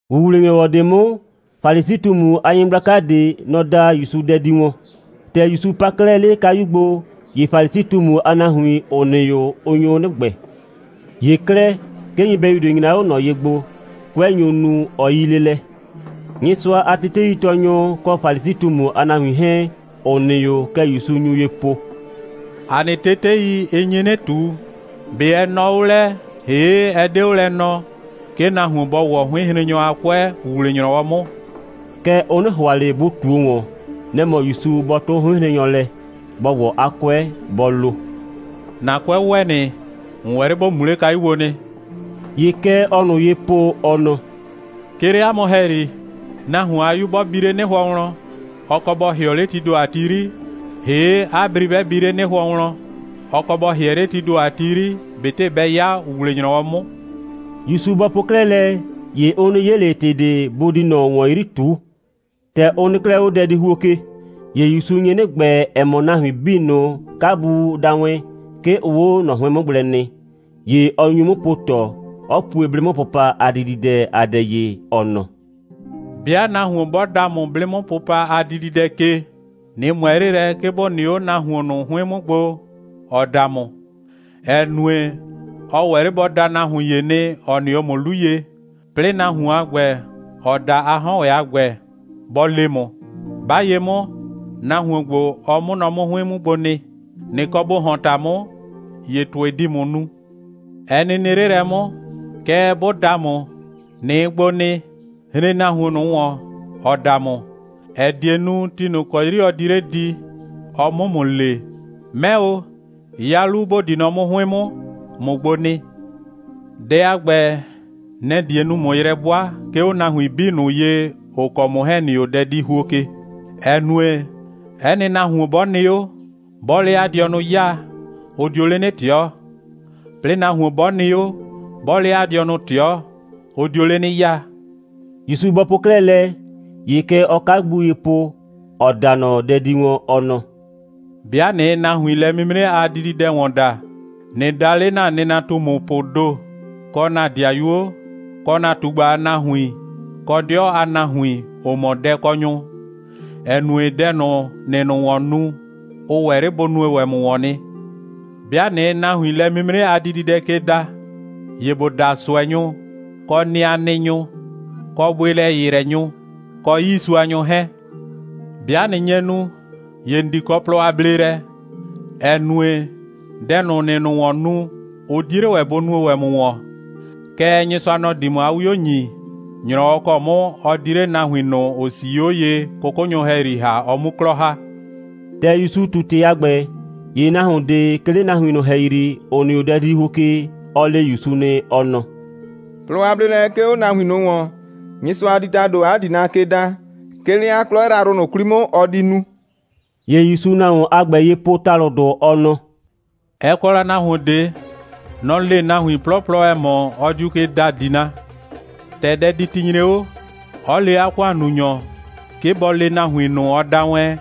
‑Wuwle‑nyrɔwɔ ꞊de 'mʋ, Falisi꞊tumu a nyɩgblaka ꞊de, nɔ‑ da ‑Yusu dɛ di wɔn. ‑Tɛ ‑Yusu pa 'klɛɛ 'le 'a kayu gbo, ‑ye Falisi꞊tumu a nahuin, ‑ʋ nɩ 'o, ʋ nyo 'nɩ ‑gbɛɛ. ‑Ye 'klɛɛ, 'ke nyɩbɛyu ꞊de nyra 'o ꞊nɔ ye gbo. 'Kʋɛ nyo nu. Ɔ 'yii 'le lɛ. Nyɩsʋa a teteitɔɔnyʋ kɔ Falisi꞊tumu a nahuin 'hɛɛn, ‑ʋ nɩ 'o, kɛ ‑Yusu nyu ye po: «‑A nɩ tetei, ɩ nyi 'nɩ ꞊tu, ꞊be ɛ nɔɔ 'o lɛ, ‑hee', ɛ 'de 'o lɛ nɔɔ, 'ke nahuon bɔ ‑wɔ 'hʋɩnhrennyɔ a 'kʋɛ ‑wuwle‑nyrɔwɔ 'mʋ?» Kɛɛ, ʋ 'nɩ ‑hʋa ꞊le bʋ ꞊tuo ‑wɔn. Nɛ‑ mɔ ‑Yusu bɔ 'tʋ 'hʋɩnhrennyɔ lɛ, bɔ ‑wɔ 'a 'kʋɛ, bɔ lo: «‑Na 'kʋɛ ‑wɛ nɩ. ‑N ‑wɛ 'le ‑bo mu 'le kayu gbo nɩ.» ‑Ye kɛ ɔɔ ꞊nʋ ye po, ɔ nɔ: «'Ke 'le 'a mʋ ‑hɛyri, nahuon a 'yu 'bɔ bi 'le 'nɩhʋɔ wlɔn, ɔ kɔ bɔ ‑hɩɔ 'le tii ‑do a ti 'yri, ‑hee' 'a bri 'bɛ bi ‑wɛ 'le 'nɩhʋɔ wlɔn, ɔ kɔ bɔ ‑hɩɛ 'le tii ‑do a ti 'yri, ꞊betɩ bɛ 'ya ‑wuwle‑nyrɔwɔ 'mʋ.» ‑Yusu bɔ po 'klɛɛ lɛ, ‑ye ʋ 'nɩ 'ye ꞊le ‑tɩ ꞊de, bʋ di ꞊nɔ ‑wɔn 'yri ꞊tu. ‑Tɛ ʋ nɩ 'klɛɛ 'o dɛdihuo ke, ‑ye ‑Yusu nye 'nɩ ‑gbɛɛ, ‑ɛ mɔ, nahuin 'bii ꞊nʋ, 'kabu da wɛn, 'ke ʋʋ 'o ꞊nɔ 'hʋɩn 'mʋ gblɛ nɩ. ‑Ye ɔ nyu 'mʋ po ꞊tɔ, 'ɔ pue 'blɩ'mʋpʋpa a dididɛ a dɛ ye, ɔ nɔ: «'Bɩa nahuon 'bɔ da ‑mʋ 'blɩ'mʋpʋpa a dididɛ ke, ꞊nɩ ꞊mʋɛ 'le lɛ, 'ke ‑bo nɩ 'o nahuon ꞊nʋ 'hʋɩn 'mʋ gbo, ‑ɔ da ‑mʋ, ‑ɛ nue, ɔ ‑wɛ 'le bɔ da nahuon ‑ye nɩ, ‑ɔ nɩ 'o ‑mʋ 'lu ye, 'plɩɩ nahuon a ‑gbɛ, ‑ɔ da a 'hɔn ‑wɛ a ‑gbɛ, bɔ le ‑mʋ: 'Ba ye 'mʋ, nahuon ‑gbo, ɔ 'mʋ nɔ 'mʋ 'hʋɩn 'mʋ gbo nɩ. ꞊Nɩ kɔ ‑bo ‑hɔn ‑ta 'mʋ, ‑ye ‑tʋɩ di ‑mʋ nu. Ɛ nɩ nɩ 'le lɛ 'mʋ, kɛɛ, 'bʋ da ‑mʋ, ꞊nɩɩ gbo nɩ, hren nahuon ꞊nʋ ‑wɔn, ‑ɔ da ‑mʋ, ‑ɛ die nu, ti ꞊nʋ ‑kɔ 'yri ɔ di 'le di, ɔ 'mʋ ‑mʋ le: 'Mɛ o, 'ya 'lu, ‑bo di mɔ 'mʋ 'hʋɩn 'mʋ, ꞊mʋ gbo nɩ. Dɛ a ‑gbɛ, nɛ‑ die nu, ꞊mʋ yrɛ 'bʋa, 'ke 'o nahuin 'bii ꞊nʋ ye, ‑ʋ kɔ ‑mʋ 'hɛɛn ‑nɩ 'o dɛdihuo ke, ‑ɛ nue, 'ɛ nɩ nahuon 'bɔ nɩ 'o, 'bɔɔ 'le 'a dɩɔnʋ 'yaa, ʋ dio 'le 'nɩ ꞊tɩɔ, 'plɩɩ nahuon 'bɔ nɩ 'o, 'bɔɔ 'le 'a dɩɔnʋ ꞊tɩɔ, ʋ dio 'le 'nɩ 'yaa.» ‑Yusu bɔ po 'klɛɛ lɛ, ‑ye kɛ ɔɔ 'kabu ye po, ‑ɔ da ꞊nɔ dɛ di wɔn, ɔ nɔ: «'Bɩa ꞊nɩɩ nahuin lɛ'mimre a dididɛ ‑wɔn da, ꞊nɩ da 'le ‑na nɩnatumupʋʋ ‑do, kɔ ‑na 'dɩayuo, kɔ ‑na ꞊tugba a nahuin, kɔ 'dɩɔ a nahuin, ‑ʋ mɔ dɛkɔnyʋ, ‑ɛ nue, dɛ ꞊nʋ, ‑nɩɩ ꞊nʋ ‑wɔn nu, ʋ ‑wɛ 'le bʋ nue ‑wɛ ‑mʋ ‑wɔn nɩ. 'Bɩa ꞊nɩɩ nahuin lɛ'mimre a dididɛ ke da, ‑ye ‑bo da ꞊sʋɛnyʋ, kɔ nɩanɩnyʋ, kɔ bʋɩlɛ‑yɩyrɛnyʋ, kɔ 'yiisuanyʋ 'hɛɛn. 'Bɩa ꞊nɩ nye nu, ‑ye ‑n di kɔ plɔ a bleelɛ, ‑ɛ nue, dɛ ꞊nʋ, ‑nɩɩ ꞊nʋ ‑wɔn nu, ʋ 'die 'le ‑wɛ bʋ nue ‑wɛ ‑mʋ ‑wɔn. Kɛɛ, Nyɩsʋa, nɔ‑ di ‑mʋ 'a 'wio ‑nyi, ‑nyrɔwɔ ‑kɔ 'mʋ ɔ di 'le nahuin ꞊nʋ, ‑ʋ 'sii 'o ye, 'kʋkʋnyʋ ‑hɛyri ‑ha, ɔ 'mu 'klɔ ‑ha.» ‑Tɛ ‑Yusu ꞊tu ‑tɩ a ‑gbɛ, ‑ye nahuon ꞊de, 'ke 'le nahuin ꞊nʋ ‑hɛyri, ‑ʋ nɩ 'o dɛdihuo ke, ɔ le ‑Yusu nɩ, ɔ nɔ: «Plɔ a bleelɛ 'ke 'o nahuin ꞊nʋ ‑wɔn, Nyɩsʋa di ‑tado 'a ‑dina ke da, 'ke 'le 'a 'klɔ yrayrʋ ꞊nʋ 'kwli 'mʋ, ɔ di nu.» ‑Ye ‑Yusuu nahuon a ‑gbɛ ye po ‑talʋdʋ, ɔ nɔ: «Ɛ kɔ la nahuon ꞊de. Nɔ‑ le nahuin 'plɔplɔ, ‑ɛ mɔ, ɔ diu ke da ‑dina. ‑Tɛ dɛditi nyre 'o, 'ɔ le 'a ‑kʋannunyɔ, 'ke bɔ le nahuin ꞊nʋ, ɔ da wɛn,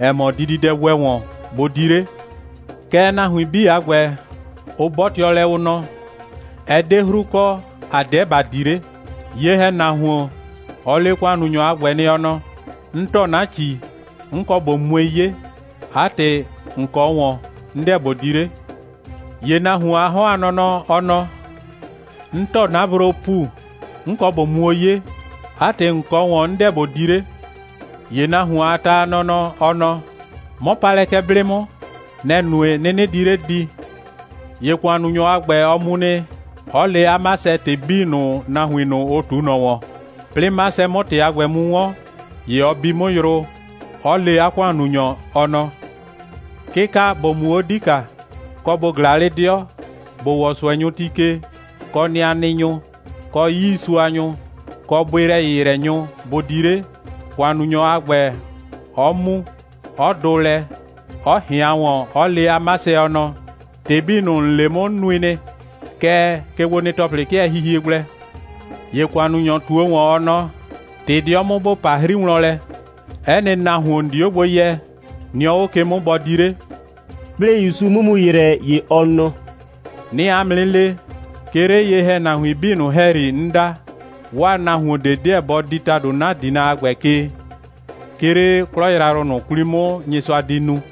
‑ɛ mɔ, dididɛ ‑wɛ ‑wɔn, bʋ di 'le. Kɛɛ, nahuin 'bii a ‑gbɛ, ʋ 'bɔtɩɔ lɛ, ʋ nɔ: Ɛ 'de 'hru kɔ, ‑a 'deɛ ‑ba di 'le. Ye‑hɛnahuon, ɔ le ‑kʋannunyɔ a ‑gbɛ nɩ, ɔ nɔ: 'N ‑tɔ 'na ‑ci. 'N kɔ ꞊bo mue 'ye. 'A ‑tɩ, ‑n kɔ 'o ꞊wɔn, 'n 'deɛ ꞊bo di 'le. ‑Ye nahuon a 'hɔn a nɔnɔ, ɔ nɔ: 'N ‑tɔ 'na broo ‑pu. 'N kɔ ꞊bo muo 'ye. 'A ‑tɩ, ‑n kɔ 'o ꞊wɔn, 'n 'deɛ ꞊bo di 'le. ‑Ye nahuon a ta nɔnɔ, ɔ nɔ: 'Mɔ pa lɛ kɛ 'blɩ 'mʋ. Nɛ‑ nue, 'nɩnɩ di 'le di. ‑Ye ‑kʋannunyɔ a ‑gbɛ, ɔ mu nɩ, 'ɔ le 'a 'masɛ ‑tɩ 'bii ꞊nʋ, nahuin ꞊nʋ, ʋ ꞊tu ꞊nɔ ‑wɔn. 'Plɩɩ 'masɛ 'mʋ ‑tɩ a ‑gbɛ mu 'wɔn, ‑ye ɔ bi 'mʋ yrʋ, 'ɔ le 'a ‑kʋannunyɔ, ɔ nɔ: 'Kɩka, ‑bo mu 'o 'dika, kɔ ‑bo ꞊glaa 'le 'dɩɔ, ‑bo ‑wɔ ꞊sʋɛnyʋ ti ke, kɔ nɩanɩnyʋ, kɔ 'yiisuanyʋ, kɔ bʋɩlɛ‑yɩyrɛnyʋ, bʋ di 'le, ‑kʋannunyɔ a ‑gbɛ 'ɔ mu, 'ɔ dʋ lɛ, 'ɔ ꞊hɩan ‑wɔn, 'ɔ le 'a 'masɛ, ɔ nɔ: ‑Tɩ 'bii ꞊nʋ, ‑n le 'mʋ, 'n nui nɩ. Kɛɛ, kegbonɩ‑tɔplɩ 'kɩɛ hihie gblɛ. ‑Ye kayukɔnyɔ ꞊tuo ‑wɔn, ɔ nɔ: ꞊Tɩ 'dɩɔ 'mʋ, ‑bo pa 'hri wlɔn lɛ, 'ɛ nɩ nahuon, ‑n di 'o gbo yɛ, nɩ 'o ꞊nɔ ke 'mʋ, bɔ di 'le!» 'Plɩɩ ‑Yusu 'mʋ mu ‑yrɛ, ‑ye ɔ nɔ: «'Nɩɩ 'a mʋ 'nɩ le, 'ke 'le ye‑hɛnahuin 'bii ꞊nʋ ‑hɛyri, 'n da, 'waa nahuon ꞊de 'deɛ bɔ di ‑tado 'na ‑dina a ‑gbɛ ke, 'ke 'le 'klɔ yrayrʋ ꞊nʋ 'kwli 'mʋ, Nyɩsʋa di nu.»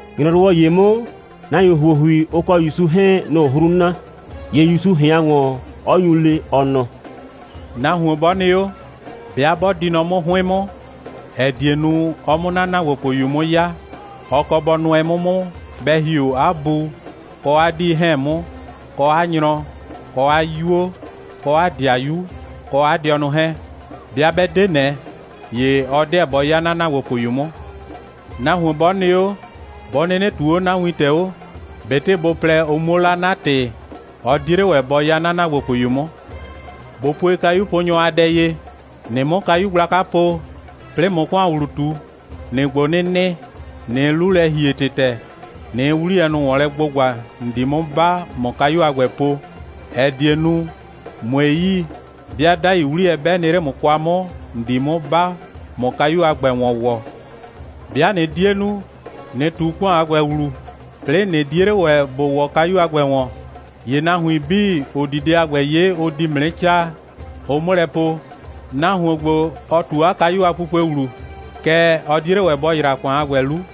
‑Nyrɔwɔ ‑ye 'mʋ, nahuin ‑huohui, ʋ kɔ ‑Yusu 'hɛɛn, nʋ‑ʋ 'hru na. ‑Ye ‑Yusu ꞊hɩan ‑wɔn, 'ɔ nyu le, ɔ nɔ: «Nahuon 'bɔ nɩ 'o, 'bɩa 'bɔ di nɔ 'mʋ 'hʋɩn 'mʋ, ‑ɛ die nu, ɔ 'mʋ 'na ‑naagbopʋyu 'mʋ 'ya, ɔ kɔ bɔ nʋɛ 'mʋ 'mʋ, bɛ ‑hi 'o 'a bu kɔ 'a 'dii 'hɛɛn 'mʋ, kɔ 'a nyrɔ, kɔ 'a 'yuo, kɔ 'a ‑dɩayuo, kɔ 'a dɩɔnʋ 'hɛɛn. 'Bɩa 'bɛ 'de ꞊nɛ, ‑ye ɔ 'deɛ bɔ 'ya 'na ‑naagbopʋyu 'mʋ. Nahuon 'bɔ nɩ 'o, 'bɔ 'nɩnɩ ꞊tuu 'o 'na wintɛ 'o, ꞊betɩ bʋ plɛ, ʋ 'muo 'la 'na ‑tɩ, ɔ 'die 'le ‑wɛ bɔ 'ya 'na ‑naagbopʋyu 'mʋ. ꞊Bo pue kayuponyɔ a dɛ ye. ꞊Nɩ 'mʋ kayu gblaka po, 'plɩɩ ꞊mʋ ‑kʋan ‑wlu ꞊tu, ‑nɩɩ gbo 'nɩ nɩ, ꞊nɩɩ 'lu lɛ ‑hie ‑tɩtɛ, ꞊nɩɩ 'wliyɛ ꞊nʋ ‑wɔn lɛ gbʋgba, ‑n di 'mʋ 'ba, ꞊mʋ kayu a ‑gbɛ po, ‑ɛ die nu, ꞊mue yi, 'bɩa 'dai 'wliyɛ, 'bɛ nɩ 'le ‑mʋ kwa 'mʋ, ‑n di 'mʋ 'ba, ꞊mʋ kayu a ‑gbɛ ‑wɔn ‑wɔ. 'Bɩa ꞊nɩ 'die nu, ꞊nɩ ꞊tu ‑kʋan a ‑gbɛ ‑wlu, 'plɩɩ, ꞊nɩ 'die 'le ‑wɛ ‑bo ‑wɔ kayu a ‑gbɛ ‑wɔn, ‑ye nahuin 'bii, ‑ʋ di dɛ a ‑gbɛ 'ye, ʋ di ‑mʋ 'nɩ 'caa, ʋ 'mʋ lɛ po: Nahuon ‑gbo, ɔ ꞊tu 'a kayu a pupue ‑wlu, kɛɛ, ɔ 'die 'le ‑wɛ bɔ ‑yra ‑kʋan a ‑gbɛ 'lu.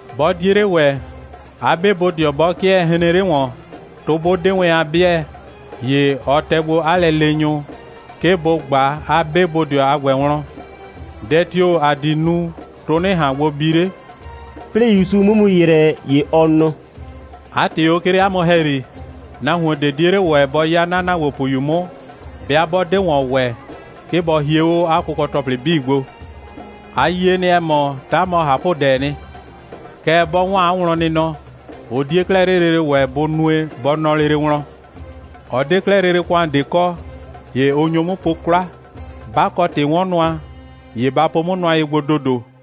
'Bɔ 'die 'le ‑wɛ, 'a 'be bodɩɔ 'bɔ 'kɩɛ hreen 'le ‑wɔn, tʋ 'bʋ 'de wɛn a 'bɩɛ, ‑ye ɔ tɛ gbo 'a lɛleenyʋ, 'ke bʋ ꞊gba 'a 'be bodɩɔ a ‑gbɛ wlɔn: Dɛ tio‑ ‑a di nu, tʋ 'nɩ ꞊han gbo bi 'le?» 'Plɩɩ ‑Yusu 'mʋ mu ‑yrɛ, ‑ye ɔ nɔ: «'A ‑tɩ o, 'ke 'le 'a mʋ ‑hɛyri, nahuon ꞊de 'die 'le ‑wɛ bɔ 'ya 'na ‑naagbopʋyu 'mʋ, 'bɩa 'bɔ 'de ‑wɔn ‑wɛ, 'ke bɔ hie 'o 'a kʋkɔ‑tɔplɩ 'bii gbo. A yie nɩ, ‑ɛ mɔ, 'ta mɔ ꞊hapʋdɛɛ nɩ. Kɛɛ, 'bɔ 'waan 'a wlɔnnɩnɔ, ʋ 'die 'klɛɛ 'le lele ‑wɛ bʋ nue, bɔ nɔ lele wlɔn. Ɔ 'de 'klɛɛ lele ‑kʋan ꞊de kɔ. ‑Ye ʋ nyo 'mʋ po 'kwla. 'Ba kɔ ‑tɩ'wɔnnʋa, ‑ye ba po 'mʋ nʋa ye gbo ‑dodo.»